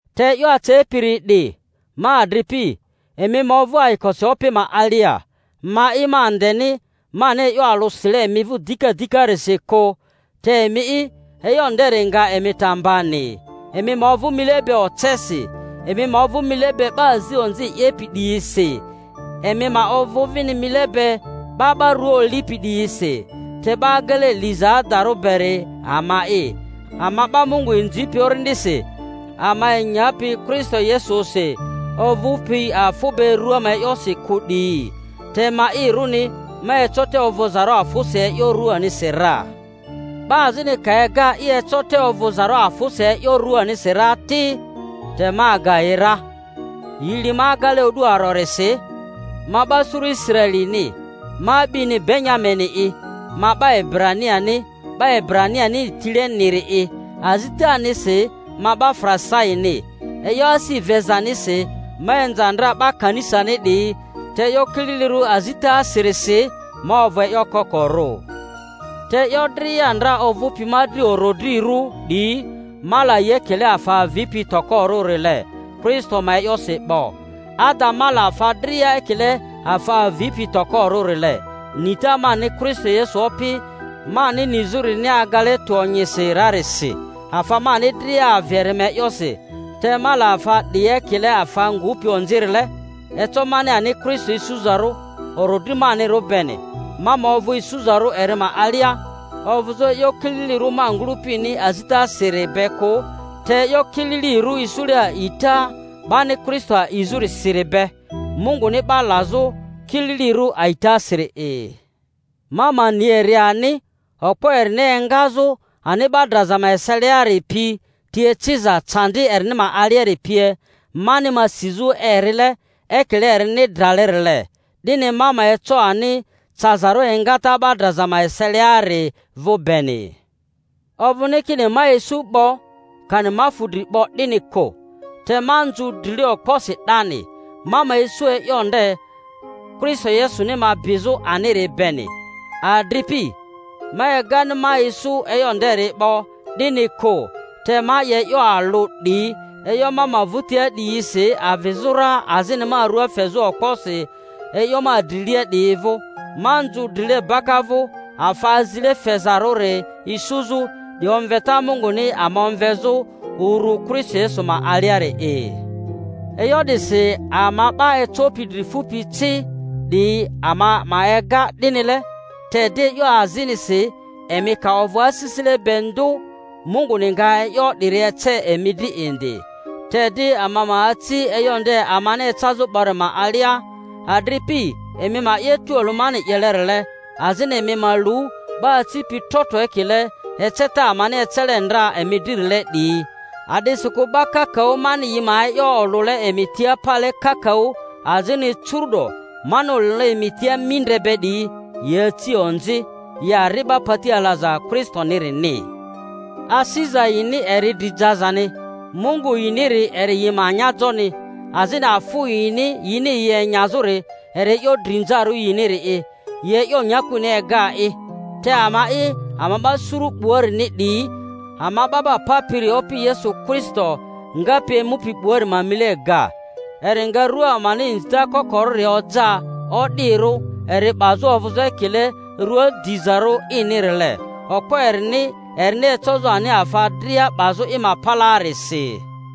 Te e'yo acepiri 'di, ma adripi, emi ma ovᴜ ayikosi Opi ma alia. Ma'i ma andeni mani e'yo alᴜ sile emi vᴜ dika dikarisi kᴜ, te emi'i, e'yo nderi nga emi ta mbani. Emi ma ovᴜ mile be ocesi, emi ma ovᴜ mile be 'ba azi onzi 'yepi 'diyisi, emi ma ovᴜ vini mile be 'ba 'ba rua olipi 'diyisi. Te 'ba agele liza adarᴜ beri ama'i, ama 'ba Mungu inzipi Orindisi, ama enyapi Kristo Yesusi, ovᴜpi afᴜ be rᴜa ma e'yosi kᴜ 'diyi. Te ma'irᴜni, ma eco te ovᴜzarᴜ afᴜsi e'yo ruanisi ra. Ba azini ka ega i eco te ovᴜzarᴜ afᴜsi e'yo ruanisi ra ti, te ma aga yi ra: yi li ma agele o'du arorisi, ma 'ba suru Israelini, ma a'bini Benya-mini'i, ma 'ba Ebraniani 'ba Ebra-nianini tileniri'i; azitanisi ma 'ba Farisaini; e'yo asi vezanisi, ma inza ndra 'ba kanisani 'diyi; te e'yo kililirᴜ azitasirisi ma ovᴜ e'yo kokorᴜ. Te e'yo dria ndra ovᴜpi ma dri orodrirᴜ 'diyi, ma la yi ekile afa avipi tokorᴜrile Kristo ma e'yosi 'bo. Ada, ma la afa dria ekile afa avipi tokorᴜrile, nita mani Kristo Yesu Opi mani nizᴜrini agale tᴜ onyisi rarisi. Afa mani dria avi eri ma e'yosi, te ma la afa 'diyi ekile afa ngupi onzirile, eco mani ani Kristo isuzarᴜ orodri manirᴜ beni, ma ma ovᴜ isuzarᴜ eri ma alia, ovᴜzᴜ e'yo kililirᴜ ma ngᴜlᴜpini azitasiri be kᴜ, te e'yo kililirᴜ isule a'ita 'bani Kristo a'izᴜrisiri be, Munguni 'ba lazᴜ kililirᴜ a'itasiri'i; ma ma ni eri ani, okpo erini engazᴜ ani 'ba draza ma eseliari pi, ti eciza candi erini ma aliari pie, mani ma sizᴜ erile ekile erini dralerile, 'dini ma ma eco ani cazarᴜ engata 'ba draza ma eselia-ri vᴜ beni. Ovᴜni kini ma isu 'bo, kani ma fu dri 'bo, 'dini kᴜ; te ma nzᴜ drile okposi 'dani, ma ma isu e'yo nde Kristo Yesuni ma bizᴜ aniri beni. Adripi, ma egani ma isu e'yo nderi 'bo, 'dini kᴜ; te ma 'ye e'yo alᴜ 'di, e'yo ma ma vᴜtia 'diyisi avizᴜ ra azini ma rua fezᴜ okposi e'yo ma drilia 'diyi vᴜ, ma nzᴜ drile baka vᴜ, afa azile fezarᴜri isuzᴜ, 'di omveta Munguni ama omvezᴜ uru Kristo Yesu ma aliari'i. E'yo 'disi ama 'ba ecopi dri fupi ci 'diyi ama ma ega 'dinile; te di e'yo azinisi emi ka ovᴜ asisile be ndᴜ, Munguni nga e'yo 'diri ece emi dri indi. Te di ama ma aci e'yo nde amani ecazᴜ 'bori ma alia. Adripi, emi ma 'ye tualᴜ mani 'yelerile, azini emi ma lu 'ba acipi tro tro ekile eceta amani ecele ndra emi dririle 'diyi. A'disikᴜ 'ba kakaᴜ mani yi ma e'yo olᴜle emi tia pale kakaᴜ, azini curu'do mani olᴜle emi tia mindre be 'diyi, yi aci onzi, yi ari'ba pati alaza Kristonirini. Asiza yini eri dri jazani, mungu yiniri eri yi ma anyajoni, azini afᴜ yini yini yi enyazᴜri eri e'yo drinzarᴜ yiniri'i, yi e'yo nyakuni ega'i. Te ama'i, ama 'ba suru 'buarini 'diyi, ama 'Ba 'ba Papiri Opi Yesu Kristo ngapi emupi 'buari ma mile ga; eri nga rua amani inzita kokorᴜri oja o'dirᴜ eri 'bazᴜ ovᴜzᴜ ekile rᴜa dizarᴜ inirile, okpo erini erini ecozᴜ ani afa dria 'bazᴜ i ma palaarisi.